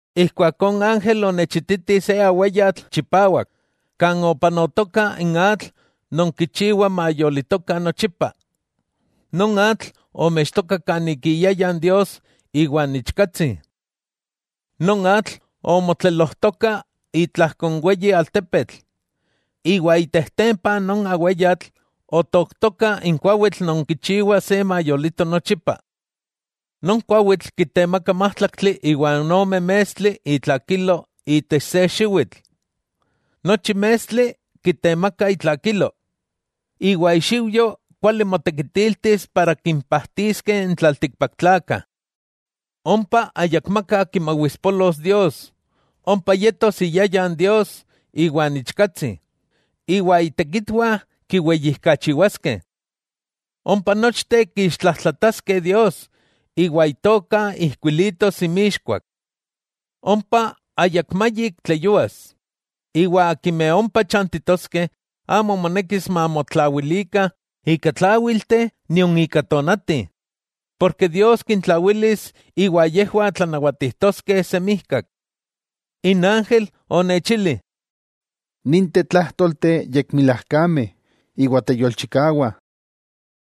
Ijkuakó n ángel onechititi se aweyatl chipawak kan opanotoka n atl non kichiwa mayolitokah nochipa. Non atl omextoka kanik iyayan Dios iwa n Ichkatsi. Non atl omotlelojtoka itlajko n weyi altepetl, iwa itejtempa non aweyatl, otooktoka n kuawitl non kichiwa se mayolito nochipa. Non kuawitl kitemaka májtlaktli iwa ome mestli itlakilo itech se xiwitl. Nochi mestli kitemaka itlakilo, iwa ixiujyo kuali motekitiltis para kimpajtiskeh n tlaltikpaktlakah. Ompa ayakmaka kimawispolos Dios. Ompa yetos iyayan Dios iwa n Ichkatsi, iwa itekitwah kiweyijkachiwaskeh. Ompa nochteh kiixtlajtlataskeh Dios, iwa Itoka ijkuilitos inmixkuak. Ompa ayakmayik tleyúas, iwa akimeh ompa chantitoskeh amo monekis mamotlawilikah ika tláwilteh nion ika tonati, porke Dios kintlawilis, iwa yejwah tlanawatijtoskeh semijkak. N ángel onechili: —Ninteh tlájtolteh yekmilajkameh, iwa teyolchikawah.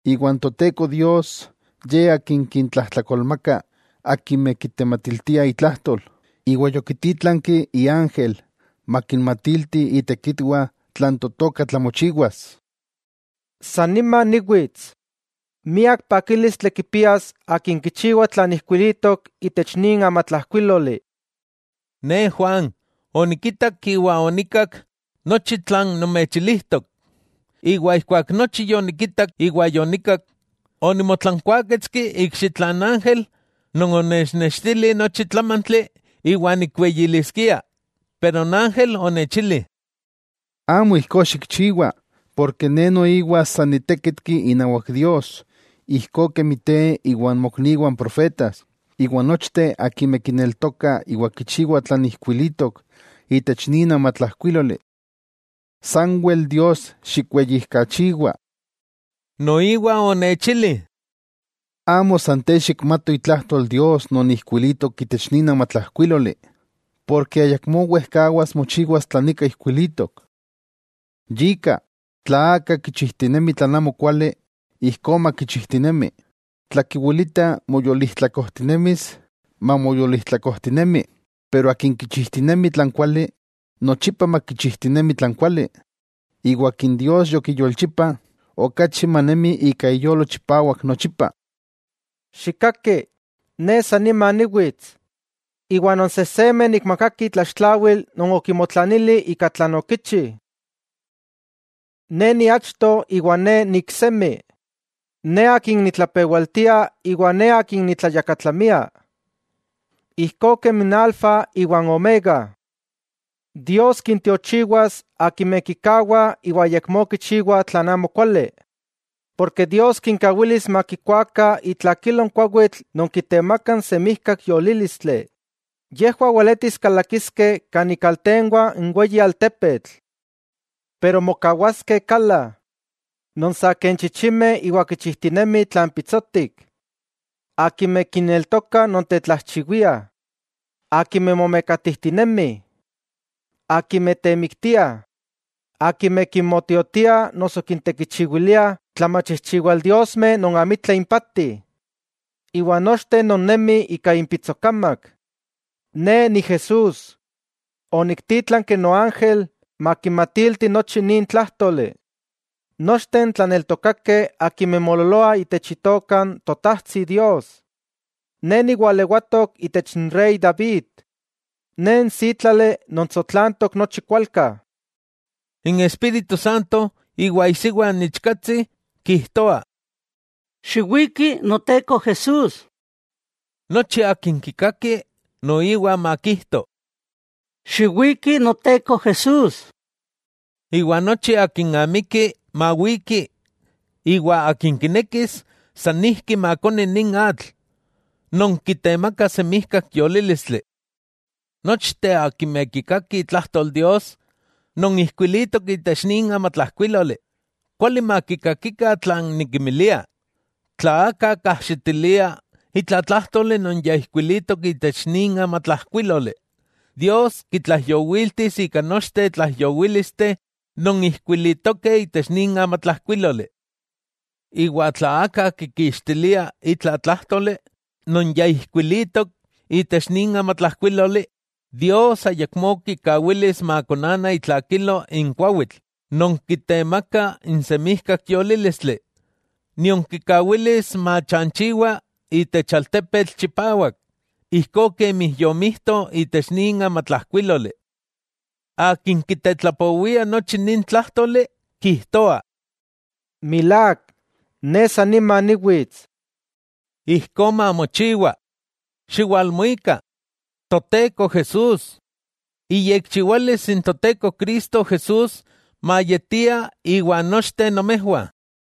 Iwa n Toteko Dios, Ye Akin kintlajtolmaka akimeh kitematiltia itlajtol, iwa yokitítlanki iángel makinmatilti itekitwah tlan totoka tlamochiwas. —¡Sanima niwits! ¡Miak pakílistli kipias akin kichiwa tlan ijkuilitok itech nin amatlajkuíloli! Ne, Juan, onikitak iwa onikak nochi tlan nomechilijtok. Ijkuak nochi yonikitak iwa yonikak, onimotlankuáketski ikxitla n ángel non onechnextili nochi tlámantli iwa nikweyiliskia, pero n ángel onechili: —Amo ijkó xikchiwa, ne noiwa san ni tékitki inawak Dios, ijkó kemi te iwa n mokniwah n profetas, iwa nochteh akimeh kineltokah iwa kichiwah tlan ijkuilitok itech nin amatlajkuíloli. Sanwel Dios xikweyijkachiwa. Noiwa onechili: —Amo san te xikmato itlajtol Dios non ijkuilitok itech nin amatlajkuíloli, ken ayakmó wejkawas mochiwas tlan nika ijkuilitok. Yika, tla aka kichijtinemi tlan amokuali, ijkó makichijtinemi; tla kiwilita moyolijtlakojtinemis, mamoyolijtlakojtinemi. Iwa akin kichijtinemi tlan kuali, nochipa makichijtinemi tlan kuali, iwa akin Dios yokiyolchipa, okachi manemi ika iyolo chipawak nochipa. —Xikkaki, Ne sannima niwits, iwa non sejsemeh nikmakaki itlaxtlawil non okimotlanili ika tlan okichi. Ne niachto iwa Ne niiksemi, Ne Akin nitlapewaltia iwa Ne Akin nitlayakatlamia, ijkó kemi n Alfa iwa n Omega. Dios kintiochiwas, akimeh kikawah iwa ayakmó kichiwah tlan amokuali. Dios kinkawilis makikuakah itlakilo n kuawitl non kitemakah n semijkak yolílistli. Yejwah weletis kalakiskeh kan ikaltenwah n weyi altepetl. Pero mokawaskeh kala, non saken chichimeh iwa kichijtinemih tlan pitsotik, akimeh kinneltokah nontetlajchiwiah, akimeh momekatijtinemih, akimeh temiktiah, akimeh kinmotiotiah noso kintekichiwiliah tlamachijchiwaldiosmeh non amitla impati, iwa nochteh non nemih ika inpitsokamak. —Ne Ni Jesús, oniktítlanki noángel makinmatilti nochi nin tlájtoli, nochteh n tlaneltokakeh akimeh moololoah itech Itoka n Totajtsi Dios. Ne ni walewatok itech n rey David. Ne n sítlali non tsotlantok nochi kualka. N Espíritu Santo iwa isiwa n Ichkatsi kijtoah: —Xiwiki Noteko Jesús. Nochi akin kikaki, noiwa makijto: —Xiwiki Noteko Jesús. Iwa nochi akin amiki, mawiki; iwa akin kinekis sanijki makoni nin atl, non kitemaka semijkak yolílistli. Nochteh akimeh kikakih itlajtol Dios non ijkuilitok itech nin amatlajkuíloli; kuali makikakikah tlan nikinmilia: Tla aka kajxitilia itla tlájtoli non ya ijkuilitok itech nin amatlajkuíloli, Dios kitlaijyowiltis ika nochteh tlaijyowílisteh non ijkuilitokeh itech nin amatlajkuíloli. Iwa tla aka kikixtilia itla tlájtoli non yaijkuilitok itech nin amatlajkuíloli, Dios ayakmó kikawilis makonana itlakilo n kuawitl non kitemakah n semijkak yolílistli, nion kikawilis machanchiwa itech altepetl chipawak, ijkó kemi yomijto itech nin amatlajkuíloli. Akin kitetlapowia nochi nin tlájtoli, kijtoa: —Milák, Ne sanima niwits. Ijkó mamochiwa. ¡Xiwalmuika, Toteko Jesús! Iyekchiwalis n Toteko Jesús mayetia iwan nochteh nomejwah.